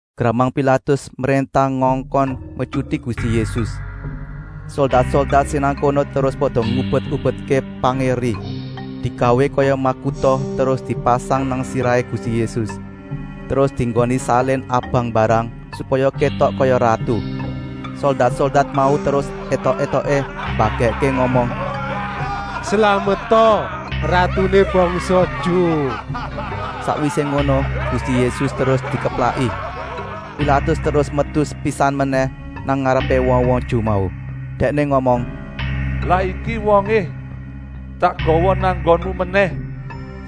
Gramang Pilatus mréntah ngongkon metyuti Gusti Yésus. Soldat-soldat sing nang kono terus pada ngubet-ubetké pangé eri digawé kaya makuta terus dipasang nang sirahé Gusti Yésus, terus dienggoni salin abang mbarang, supaya kétok kaya ratu. Soldat-soldat mau terus étok-étoké mbagèkké ngomong: “Slameta ratuné bangsa Ju!” Sakwisé ngono Gusti Yésus terus dikeplaki. Pilatus terus metu sepisan menèh nang ngarepé wong-wong Ju mau! Dèkné ngomong: “Lah iki wongé tak gawa nang nggonmu menèh.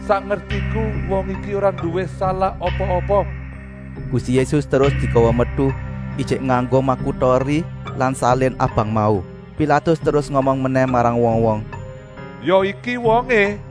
Sak ngertiku wong iki ora nduwé salah apa-apa!” Gusti Yésus terus digawa metu, ijik nganggo makuta eri lan salin abang mau. Pilatus terus ngomong menèh marang wong-wong: “Ya iki wongé!”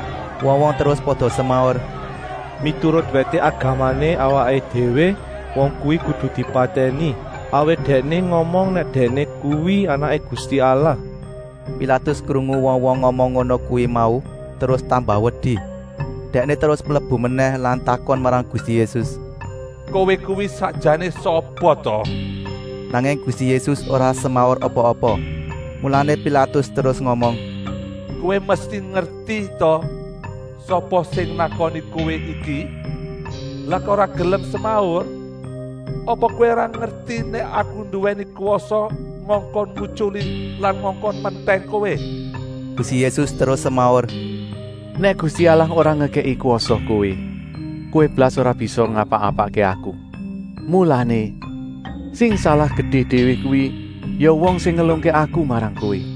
Wong-wong terus pada semaur: “Miturut wèté agamané awaké déwé wong kuwi kudu dipatèni, awit Dèkné ngomong nèk Dèkné kuwi Anaké Gusti Allah!” Pilatus krungu wong-wong ngomong ngono kuwi mau terus tambah wedi. Dèkné terus mlebu menèh lan takon marang Gusti Yésus: “Kowé kuwi sakjané sapa ta?” Nanging Gusti Yésus ora semaur apa-apa. Mulané Pilatus terus ngomong: “Kowé mesti ngerti ta sapa sing nakoni Kowé iki? Lah kok ora gelem semaur? Apa kowé ora ngerti nèk Aku nduwèni kwasa ngongkon ngutyuli lan ngongkon mentèng Kowé!” Gusti Yésus terus semaur: “Nèk Gusti Allah ora ngekèki kwasa kowé, kowé blas ora bisa ngapa-apakké Aku. Mulané, sing salah gedé déwé kuwi ya wong sing ngelungké Aku marang kowé!”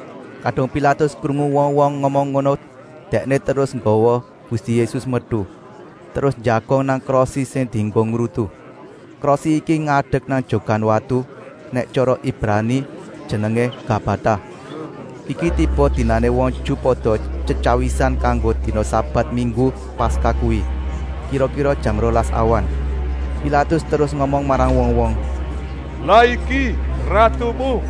Kadung Pilatus krungu wong-wong ngomong ngono dèkné terus nggawa Gusti Yésus metu, terus njagong nang krosi sing dienggo ngrutu. Krosi iki ngadek nang jogan watu, nèk tyara Ibrani jenengé Gabata. Iki tiba dinané wong Ju pada tyetyawisan kanggo dina sabat minggu Paskah kuwi, kira-kira jam rolas awan. Pilatus terus ngomong marang wong-wong: “Lah iki ratumu!”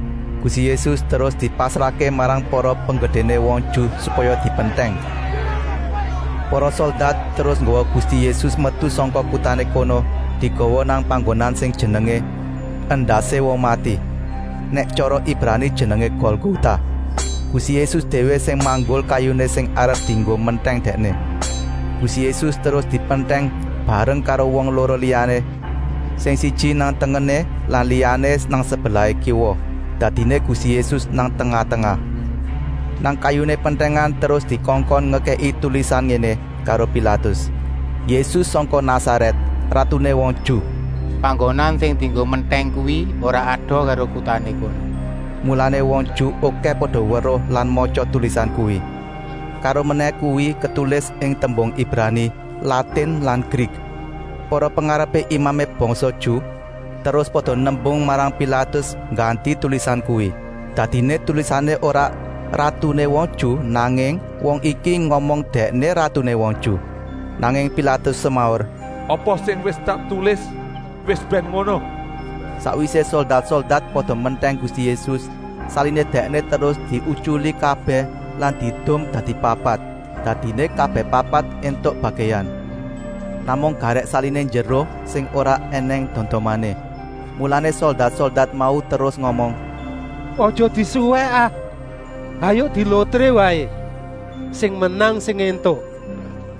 Gusti Yésus terus dipasrahké marang para penggedéné wong Ju supaya dipentèng. Para soldat terus nggawa Gusti Yésus metu sangka kutané kono digawa nang panggonan sing jenengé “Endasé Wong Mati,” nèk tyara Ibrani jenengé Golgota. Gusti Yésus déwé sing manggul kayuné sing arep dienggo mentèng Dèkné. Gusti Yésus terus dipentèng bareng karo wong loro liyané, sing siji nang tengené lan liyané nang sebelah kiwa, dadiné Gusti Yésus nang tengah-tengah. Nang kayuné pentèngan terus dikongkon ngekèki tulisan ngéné karo Pilatus: “Yésus sangka Nasarèt, ratuné wong Ju!” Panggonan sing dienggo mentèng kuwi ora adoh karo kutané kono, mulané wong Ju okèh pada weruh lan matya tulisan kuwi. Karomenèh kuwi ketulis ing tembung Ibrani, Latin lan Grik. Para pengarepé imamé bangsa Ju terus pada nembung marang Pilatus ngganti tulisan kuwi. Dadiné tulisané ora: “Ratuné wong Ju,” nanging: “Wong iki ngomong nèk Dèkné ratuné wong Ju!” Nanging Pilatus semaur: “Apa sing wis tak tulis wis bèn ngono!” Sakwisé soldat-soldat pada mentèng Gusti Yésus, saliné Dèkné terus diutyuli kabèh lan diedum dadi papat, dadiné kabèh papat éntuk bagèan. Namung garèk saliné njero, sing ora ènèng dondomané. Mulané soldat-soldat mau terus ngomong: “Aja disuwèk ah, hayuk dilotré waé, sing menang sing éntuk!”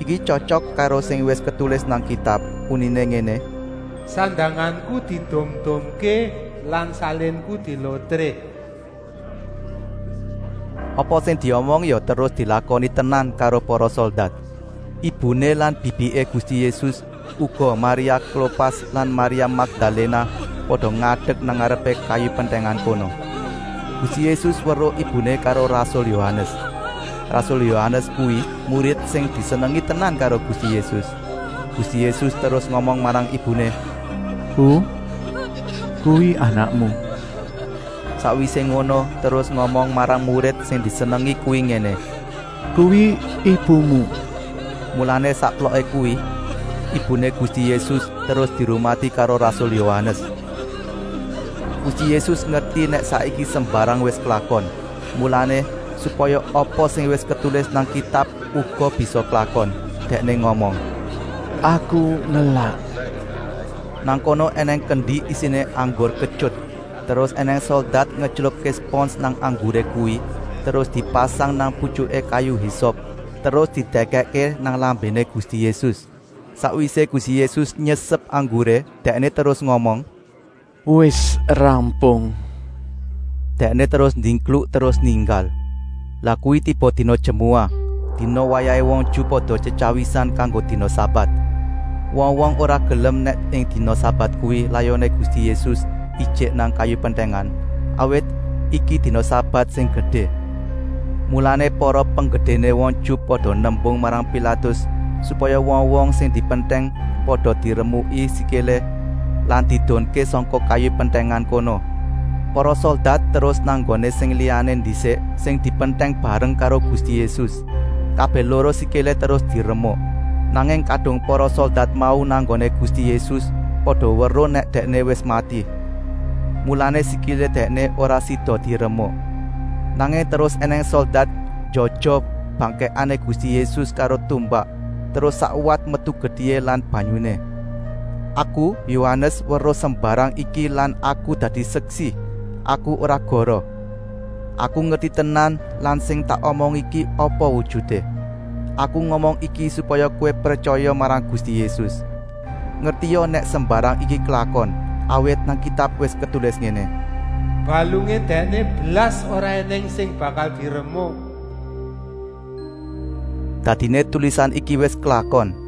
Iki tyotyok karo sing wis ketulis nang Kitab, uniné ngéné: “Sandanganku diedum-edumké lan salinku dilotré!” Apa sing diomong ya terus dilakoni tenan karo para soldat. Ibuné lan bibiké Gusti Yésus, uga Maria Klopas lan Maria Makdaléna pada ngadek nang ngarepé kayu pentèngan kono. Gusti Yésus weruh ibuné karo rasul Yohanes. Rasul Yohanes kuwi murid sing disenengi tenan karo Gusti Yésus. Gusti Yésus terus ngomong marang ibuné: “Bu, kuwi anakmu!” Sakwisé ngono terus ngomong marang murid sing disenengi kuwi ngéné: “Kuwi ibumu!” Mulané sakploké kuwi ibuné Gusti Yésus terus dirumati karo rasul Yohanes. Gusti Yésus ngerti nèk saiki sembarang wis klakon, mulané, supaya apa sing wis ketulis nang Kitab uga bisa klakon, Dèkné ngomong: “Aku ngelak!” Nang kono ènèng kendi isiné anggur ketyut. Terus ènèng soldat ngetylupké spons nang angguré kuwi terus dipasang nang putyuké kayu hisop, terus didèkèkké nang lambéné Gusti Yésus. Sakwisé Gusti Yésus nyesep angguré, Dèkné terus ngomong: “Wis rampung!” Dèkné terus ndingkluk terus ninggal. Lah kuwi tiba dina jemuah, dina wayahé wong Ju pada tyetyawisan kanggo dina sabat. Wong-wong ora gelem nèk ing dina sabat kuwi layoné Gusti Yésus ijik nang kayu pentèngan, awit iki dina sabat sing gedé. Mulané para penggedéné wong Ju pada nembung marang Pilatus, supaya wong-wong sing dipentèng pada diremuki sikilé lan diedunké sangka kayu pentèngan kono. Para soldat terus nang nggoné sing liyané ndisik sing dipentèng bareng karo Gusti Yésus. Kabèh loro sikilé terus diremuk. Nanging kadung para soldat mau nang nggoné Gusti Yésus pada weruh nèk Dèkné wis mati. Mulané sikilé Dèkné ora sida diremuk. Nanging terus ènèng soldat njojoh bangkèkané Gusti Yésus karo tumbak, terus sakwat metu getihé lan banyuné. Aku, Yohanes, weruh sembarang iki lan aku dadi seksi, aku ora goroh. Aku ngerti tenan lan sing tak omong iki apa wujuté. Aku ngomong iki supaya kowé pretyaya marang Gusti Yésus. Ngertia nèk sembarang iki klakon, awit nang Kitab wis ketulis ngéné: “Balungé Dèkné blas ora ènèng sing bakal diremuk.” Dadiné tulisan iki wis klakon.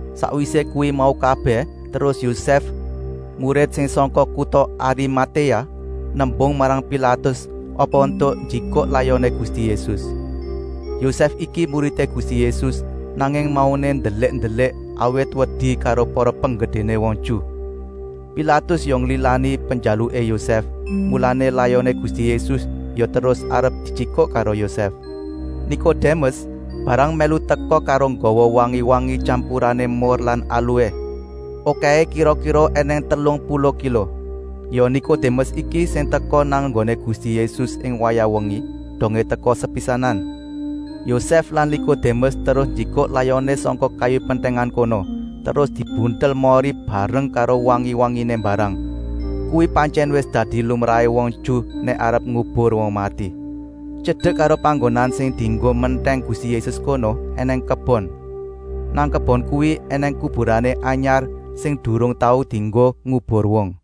Sakwisé kuwi mau kabèh terus Yosèf, murid sing sangka kuta Arimatéa, nembung marang Pilatus, apa éntuk njikuk layoné Gusti Yésus. Yosèf iki muridé Gusti Yésus, nanging mauné ndelik-ndelik, awit wedi karo para penggedéné wong Ju. Pilatus ya nglilani penjaluké Yosèf, mulané layoné Gusti Yésus ya terus arep dijikuk karo Yosèf. Nikodémes mbarang mèlu teka karo nggawa wangi-wangi tyampurané mur lan alué. Okèhé kira-kira ènèng telung puluh kilo. Ya Nikodémes iki sing teka nang nggoné Gusti Yésus ing wayah wengi, dongé teka sepisanan. Yosèf lan Nikodémes terus njikuk layoné sangka kayu pentèngan kono, terus dibuntel mori bareng karo wangi-wanginé mbarang. Kuwi pantyèn wis dadi lumrahé wong Ju nèk arep ngubur wong mati. Tyedek karo panggonan sing dienggo mentèng Gusti Yésus kono ènèng kebon. Nang kebon kuwi ènèng kuburané anyar sing durung tau dienggo ngubur wong.